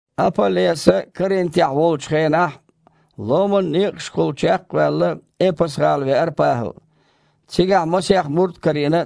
Апа-Леса Коринтехь волчу хенахь, ломан некъашкахула чекх а ваьлла, Эпас-гІала веара ПахІал. Цигахь масех мурд а карийна,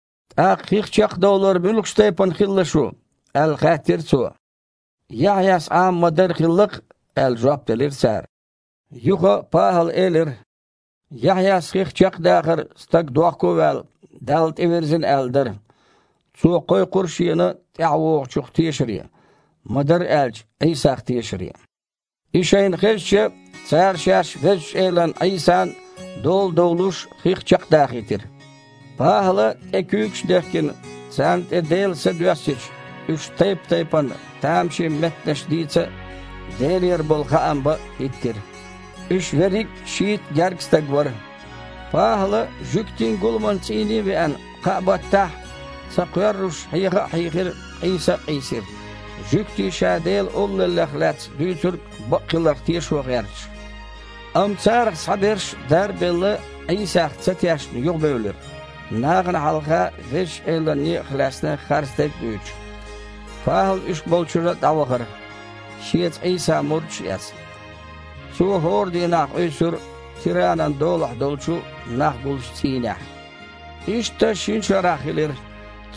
«ТІаккха хих чекхдовлар муьлхачу тайпана хилла шун?» – аьлла, хаьттира цо. «Яхьъяс Іама ма-дарра хилла-кх», – аьлла, жоп делира цара. Юха ПахІала элира: «Яхьъяс хих чекхдахар, стаг, дохко а ваьлла, Далла тІевирзина аьлла, дара. Цо кхойкхура шена ТІаьхьавогІучух тешаре, ма-дарра аьлча, Іийсах тешаре». И шайна хезча, цара шаьш Везачу Элан Іийсан дола довлуш, хих чекхдахийтира. ПахІала тІе куьйгаш а дехкина, царна тІе Делан Са доьссича, уьш тайп-тайпана тамашийна меттанаш дийца а, Делера болу хаам бан а хІиттира. Уьш верриг а шийтта гергга стаг вара. ПахІала жуьгтийн гуламан цІийне а веана, кхаа баттахь, ца кхоьрруш, хьеха а хьийхира, къийса а къийсира, жуьгтий ша Делан Олаллех лаьцна дуьйцург бакъ хиларх тешо гІерташ. Амма царах цхьаберш, дар а белла, Іийсах ца тешна юхабевлира, нахана хьалха Везачу Элан некъах лаьцна харцдерг а дуьйцуш. ПахІал уьш болчуьра дІавахара, шеца Іийсан мурдаш а эцна. Цо хІора дийнахь къуьйсура Тиранан долахь долчу, нах гуллучу цІийнехь. Иштта шина шарахь хилира,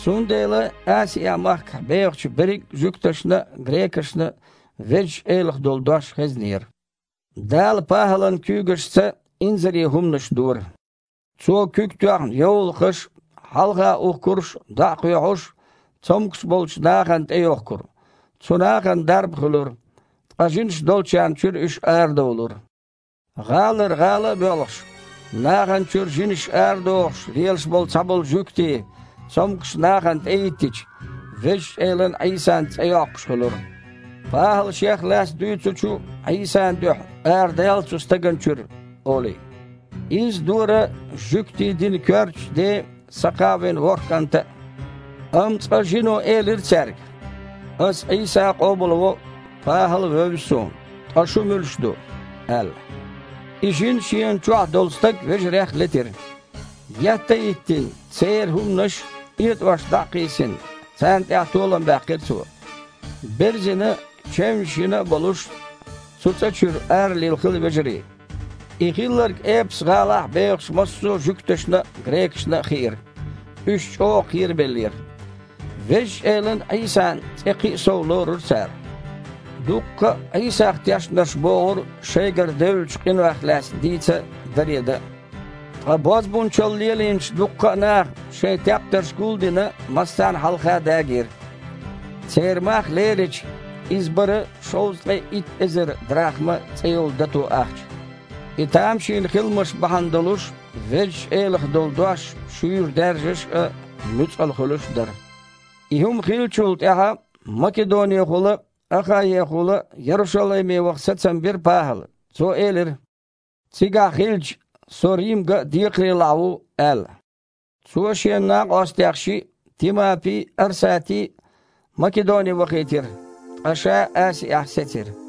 цундела Асиа-махкахь бехачу берриг а жуьгташна а, грекашна а Везачу Элах долу дош хезнера. Дала ПахІалан куьйгашца инзаре хІуманаш дора. Цо куьг тоьхна йовлакхаш а, хьалха ухкурш а дІа а кхоьхьуш, цомгуш болчу нахана тІейохкура. Цу нахана дарба хуьлура, ткъа жинаш долчарна чуьра уьш арадовлура. ГІалара гІала а боьлхуш, нахана чуьра жинаш арадохуш лелаш болу цхьаболу жуьгтий, цомгушчу нахана тІехІиттича, Везачу Элан Іийсан цІе йоккхуш хуьлура: «ПахІала Шех лаьцна дуьйцучу Іийсан дуьхьа арадала цу стагана чуьра», – олий. Изза дора жуьгтийн динан коьртачу ден Сакхавин ворхІ кІанта а. Амма цкъа жино элира цаьрга: «Ас Іийса а къобалво, ПахІал а вевза суна, ткъа шу муьлш ду?» – аьлла. И жин шена чохь долу стаг вежарех летира. Етта а йиттина, церан хІуманаш, этІош, дІа а кхийсина, царна тІехь толам баьккхира цо. Берзина, чевнаш йина а болуш, цу цІа чуьра аралилхира вежарий. И хилларг Эпас-гІалахь бехачу массо а жуьгташна а, грекашна а хиира. Уьш чІогІа кхерабеллера. Везачу Элан Іийсан цІе кхин а сов лорура цара. Дуккха а Іийсах тешнарш богІура шайгара девллачу къинойх лаьцна дийца а, даре дан а. Ткъа бозбунчалла лелийначу дуккха а наха, шайн тептарш гул а дина, массарна а хьалха дагийра. Церан мах лерича, иза бара шовзткъе итт эзар драхма цІе йолу дато ахча. И тамашийна хиламаш бахьана долуш Везачу Элах долу дош шуьйра даьржаш а, нуьцкъала хуьлуш а дара. И хІума хиллачул тІаьхьа Македонехула а, Ахаехула а Ярушалайме ваха сацам бира ПахІала. Цо элира: «Цигахь хилча, со Рим ган а декхарийлахь ву», – аьлла. Цо шен накъостех шиъ, Тимапи а, Арсати а, Македоне вахийтира, ткъа ша Асиахь сецира.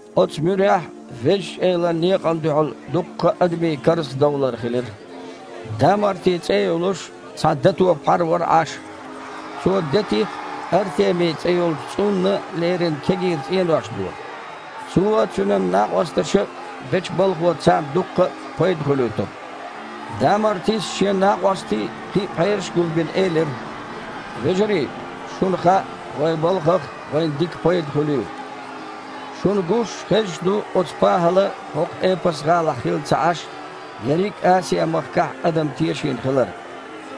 Оцу муьрехь Везачу Элан некъана дуьхьал дуккха а адамийн карзахдовлар хилира. Дамарти цІе а йолуш, цхьа дато пхьар вара Іаш. Цо детих Артеми цІе йолчу цІунна лерина кегийра цІенош дора. Цо а, цуьнан накъосташа а бечу балхо царна дуккха а пайда хуьлуьйтура. Дамартис, шен накъостий а, кхин пхьераш а гулбина, элира: «Вежарий, шуна хаьа, вайн белхах вайна дика пайда хуьлийла. Шуна гуш а, хезаш а ду оцу ПахІала хІокху Эпас-гІалахь хилла ца Іаш, ерриг а Асиа-махкахь адам тешийна хилар,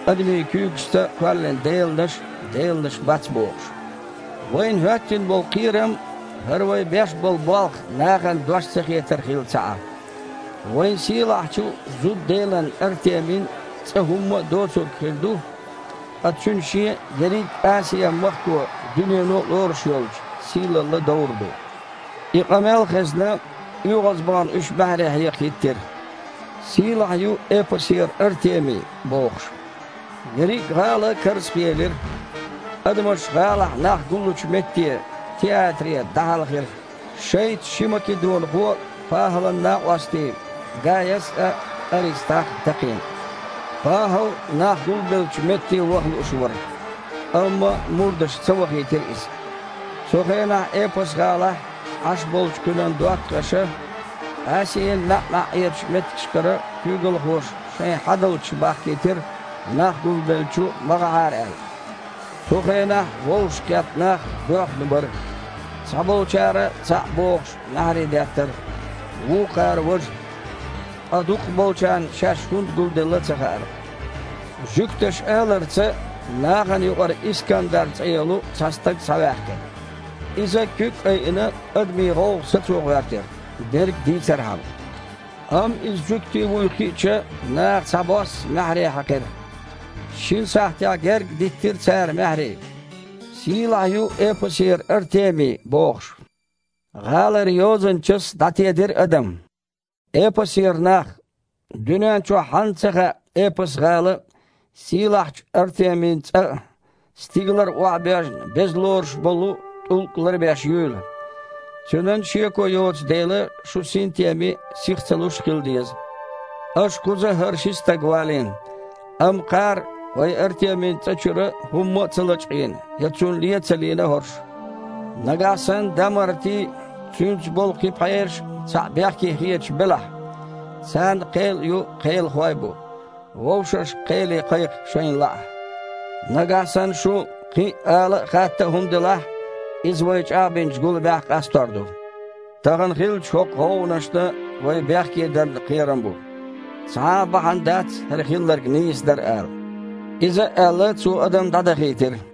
адамийн куьйгашца кхоьллина деланаш, деланаш бац бохуш. Вайна хІоьттина болу кхерам, хІара вай беш болу болх нахана дош ца хетар хилла ца Іа. Вайн сийлахьчу зуда-делан Артемин цІа хІумма а доцург хир ду, ткъа цуьнан шен а, ерриг а Асиа-махко а, дуьнено а лоруш йолчу, сийлалла довр ду». И къамел а хезна, оьгІазбахана уьш маьхьарий хьекха хІиттира: «Сийлахь ю Эпасера Артеми!» – бохуш. Ерриг а гІала карзахъелира. Адамаш гІалахь нах гуллучу метте – театре дІахьаьлхира, шайца ши македонхо, ПахІалан накъостий, Гаяс а, Арестах а, такхийна. ПахІал нах гулбеллачу метте ваха лууш вара, амма мурдаша ца вахийтира иза. Цу хенахь Эпас-гІалахь Іаш болчу кхуьнан доттагІаша, Асиин маьІ-маьІІерачу меттигашкара куьйгалхоша шайн хьадалчаш бахкийтира нах гулбеллачу ма гІахьара аьлла. Цу хенахь вовшахкхетта нах боьхна бара. Цхьаболчара, цхьаъ бохуш, маьхьарий деттара, вукхара – важа, ткъа дукхахболчарна шаьш хІунда гулделла а ца хаьара. Жуьгташа аларца нахана юкъара Искандар цІе йолу цхьа стаг схьаваьккхира. Иза, куьг а айина, адамийн гІовгІа сацо гІоьртира, дерг дийцархьама. Амма иза жуьгти вуй хиъча, наха цхьабосса маьхьарий хьаькхира. Шина сахьтехь гергга диттира цара маьхьарий: «Сийлахь ю Эпасера Артеми!» – бохуш. ГІалара йозанчас дІатедира адам: «Эпасера нах! Дуьнен чохь хьанна ца хаьа, Эпас-гІала сийлахьчу Артемин цІа а, стигалара охьабоьжна, беза лоруш болу тІулг а ларбеш юйла? Цуьнан шеко йоцу дела шу синтеме а, сих ца луш а хила деза. Аша кхуза хІара ши стаг валийна, амма кхара вайн Артемин цІа чуьра хІумма а ца лачкъийна, я цунна лен а ца лийна хІорш. Нагахь санна Дамарти а, цуьнца болу кхин пхьераш а цхьаъ бехке хеташ белахь, царна кхел а ю, кхелахой а бу: вовшашка кхеле кхайкха, шайна лаахь. Нагахь санна шун кхин ала а, хатта а хІума делахь, иза вай чІагІбинчу гуламехь къастор ду. Тахана хиллачу хІокху гІовгІанашна вай бехке дарна кхерам бу. Цхьа а бахьана дац хІара хилларг нийса дара ала». Иза а аьлла, цо адам дІадахийтира.